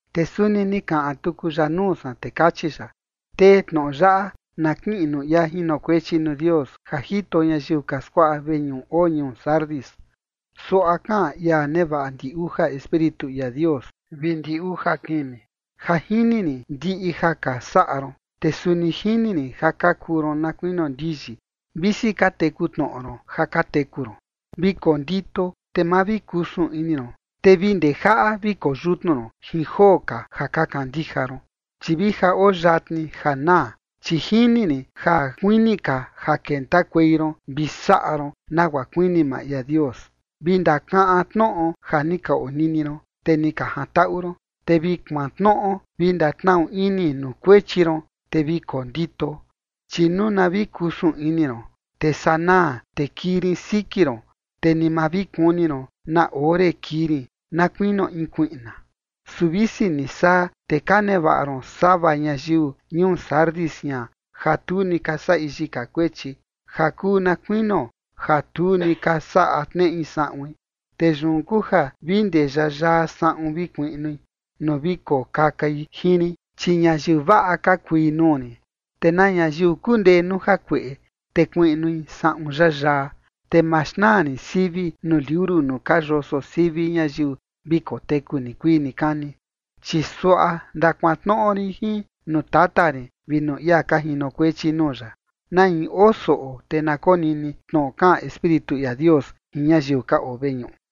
Te suni ni kaꞌan tuku ya nuu san, te kachi ya: ―Tee tnoꞌo yaꞌa na kiꞌin nuu ia jinokuechi nuu Dios ja jito ñayiu ka skuaꞌa veñuꞌu oo ñuu Sardis: Suaꞌa kaꞌan ia nevaꞌa ndi uja espíritu ia Dios vi ndi uja kimi: “Ja jini rin ndiꞌi ja ka saꞌa ron, te suni jini rin ja ka kuu ron na kuinio ndiyi, visi ka teku tnoꞌo ron ja ka teku ron. Vi kondito te ma vi kusun ini ron, te vi ndejaꞌa vi koyutnu ron jin joo ka ja ka kandija ron, chi vi ja oo yatni ja naa, chi jini rin ja kuini ka ja kentakuei ron vi saꞌa ron nagua kuini maa ia Dios. Vi ndakaꞌan tnoꞌo ja ni ka onini ron, te ni ka jantaꞌu ron, te vi kuantnoꞌo vi ndatnaꞌu ini nuu kuechi ron, te vi kondito, chi nuu na vi kusun ini ron, te sanaa te kii rin siki ron, te ni ma vi kuni ron na ore kii rin na kuinio in kuiꞌna. Su visi ni saa, te ka nevaꞌa ron sava ñayiu ñuu Sardis jian ja tu ni ka saꞌi yika kuechi, ja kuu na kuinio ja tu ni ka saꞌa tneꞌi saꞌuin. Te yun kuu ja vi ndee yayaa saꞌun vi kuiꞌnui nuu vi kokakai jin rin, chi ñayiu vaꞌa ka kui nuu rin. Te na ñayiu kundee nuu jakueꞌe, te kuiꞌnui saꞌun yayaa, te ma xnaa rin sivi nuu liuru nuu ka yoso sivi ñayiu vi koteku nikuii nikani, chi suaꞌa ndakuantnoꞌo rin jin nuu Tata rin vi nuu ia ka jinokuechi nuu ya. Na in oo soꞌo, te na konini tnoꞌo kaꞌan Espíritu ia Dios jin ñayiu ka oo veñuꞌu.”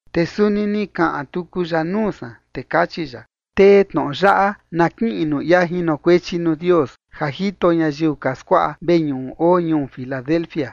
Te suni ni kaꞌan tuku ya nuu san, te kachi ya: ―Tee tnoꞌo yaꞌa na kiꞌin nuu ia jinokuechi nuu Dios ja jito ñayiu ka skuaꞌa veñuꞌu oo ñuu Filadelfia: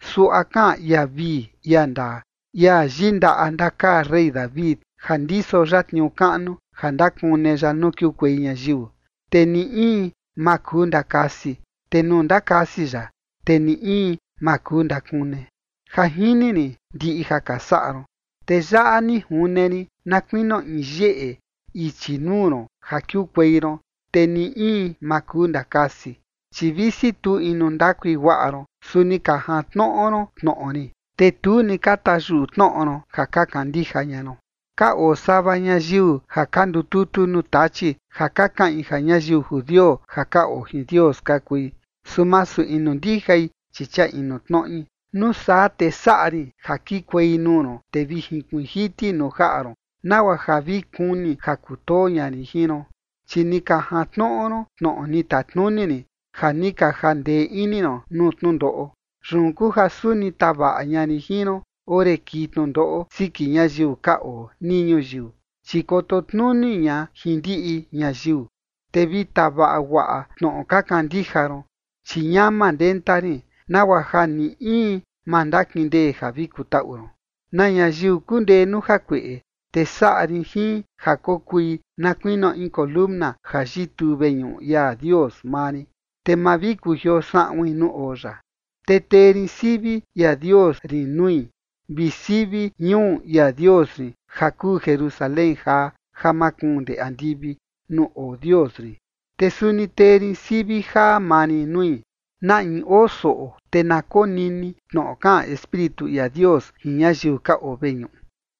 Suaꞌa kaꞌan ia vii, ia ndaa, ia yindaꞌa ndakaa rey David, ja ndiso ya tniuu kaꞌnu ja ndakune ya nuu kiukuei ñayiu, te ni in ma kuu ndakasi, te nuu ndakasi ya, te ni in ma kuu ndakune. “Ja jini rin ndiꞌi ja ka saꞌa ron. Te yaꞌa ni june rin na kuinio in yeꞌe ichi nuu ron ja kiukuei ron, te ni in ma kuu ndakasi, chi visi tu inu ndakui guaꞌa ron, su ni ka jantnoꞌo ron tnoꞌo rin, te tu ni ka tayuꞌu tnoꞌo ron ja ka kandija ña ron. Ka oo sava ñayiu ja ka ndututu nuu Tachi ja ka kaꞌin ja ñayiu judio ja ka oo jin Dios ka kui, su masu inu ndijai, chi chia inu tnoꞌi. Nuu saa te saꞌa rin ja kikuei nuu ron, te vi jinkuiin jiti nuu jaꞌa ron, nagua ja vi kuni ja kutoo ña rin jin ron. Chi ni ka jantnoꞌo ron tnoꞌo ni tatnuni rin ja ni ka jandee ini ron nuu tnundoꞌo. Yun kuu ja suni tavaꞌa ña rin jin ron ore kii tnundoꞌo siki ñayiu ka oo nii ñuyiu, chi koto tnuni ña jin ndiꞌi ñayiu. Te vi tavaꞌa guaꞌa tnoꞌo ka kandija ron, chi ñama ndenta rin, nagua ja ni in ma ndakindee ja vi kutaꞌu ron. Na ñayiu kundee nuu jakueꞌe, te saꞌa rin jin ja kokui na kuinio in siꞌin ndee ja yituu veñuꞌu ia Dios maa rin, te ma vi kujioo saꞌuin nuu oo ya. Te tee rin sivi ia Dios rin nui vi sivi ñuu ia Dios rin ja kuu Jerusalén jaa ja makuun ndee andivi nuu oo Dios rin, te suni tee rin sivi jaa maa rin nui. Na in oo soꞌo, te na konini tnoꞌo kaꞌan Espíritu ia Dios jin ñayiu ka oo veñuꞌu.”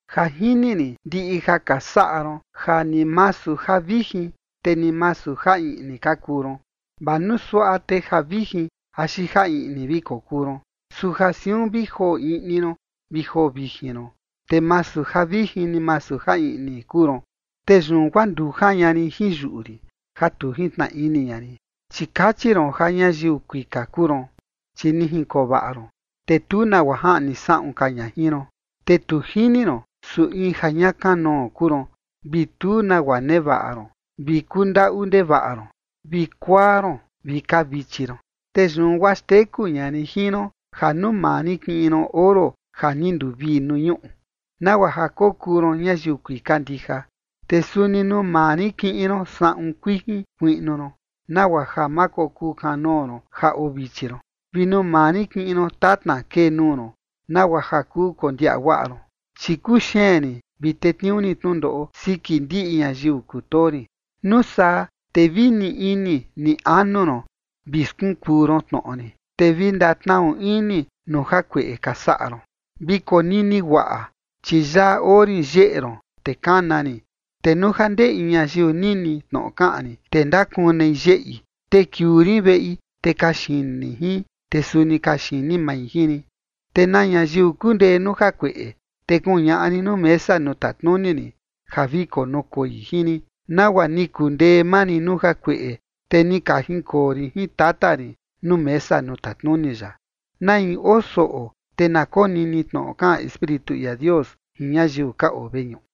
“Ja jini rin ndiꞌi ja ka saꞌa ron ja ni masu ja vijin, te ni masu ja iꞌni ka kuu ron. ¡Vaa nuu suaꞌa te ja vijin axi ja iꞌni vi kokuu ron! Su ja siun vi joo iꞌni ron vi joo vijin ron, te masu ja vijin ni masu ja iꞌni kuu ron, te yun guaa ndujan ña rin jin yuꞌu rin ja tu jintnaꞌa ini ña rin. Chi kachi ron ja ñayiu kuika kuu ron, chi ni jinkoo vaꞌa ron, te tu nagua jaꞌni saꞌun ka ña jin ron. Te tu jini ron, su in ja ña kanoo kuu ron vi tu nagua nevaꞌa ron vi kundaꞌu ndevaꞌa ron, vi kuaa ron vi kavichi ron. Te yun guaa xteku ña rin jin ron ja nuu maa rin kiꞌin ron oro ja ni nduvii nuu ñuꞌu, nagua ja kokuu ron ñayiu kuika ndija. Te suni nuu maa rin kiꞌin ron saꞌun kuijin kuiꞌnu ron, nagua ja ma kokuu kanoo ron ja oo vichi ron. Vi nuu maa rin kiꞌin ron tatna kee nuu ron, nagua ja kuu kondiaꞌa guaꞌa ron. Chi kuxeen rin vi tetniuu rin tnundoꞌo siki ndiꞌi ñayiu kutoo rin. Nuu saa te vi ni ini ni anu ron vi skunkuu ron tnoꞌo rin, te vi ndatnaꞌu ini nuu jakueꞌe ka saꞌa ron. Vi konini guaꞌa, chi yaꞌa oo rin yeꞌe ron, te kana rin. Te nuu ja ndee in ñayiu nini tnoꞌo kaꞌan rin, te ndakunei yeꞌi, te kiuu rin veꞌi, te kaxini rin jin, te suni kaxini mai jin rin. Te na ñayiu kundee nuu jakueꞌe, te kuñaꞌa rin nuu mesa nuu tatnuni rin ja vi konukoi jin rin, nagua ni kundee maa rin nuu jakueꞌe, te ni ka jinkoo rin jin Tata rin nuu mesa nuu tatnuni ya. Na in oo soꞌo, te na konini tnoꞌo kaꞌan Espíritu ia Dios jin ñayiu ka oo veñuꞌu.”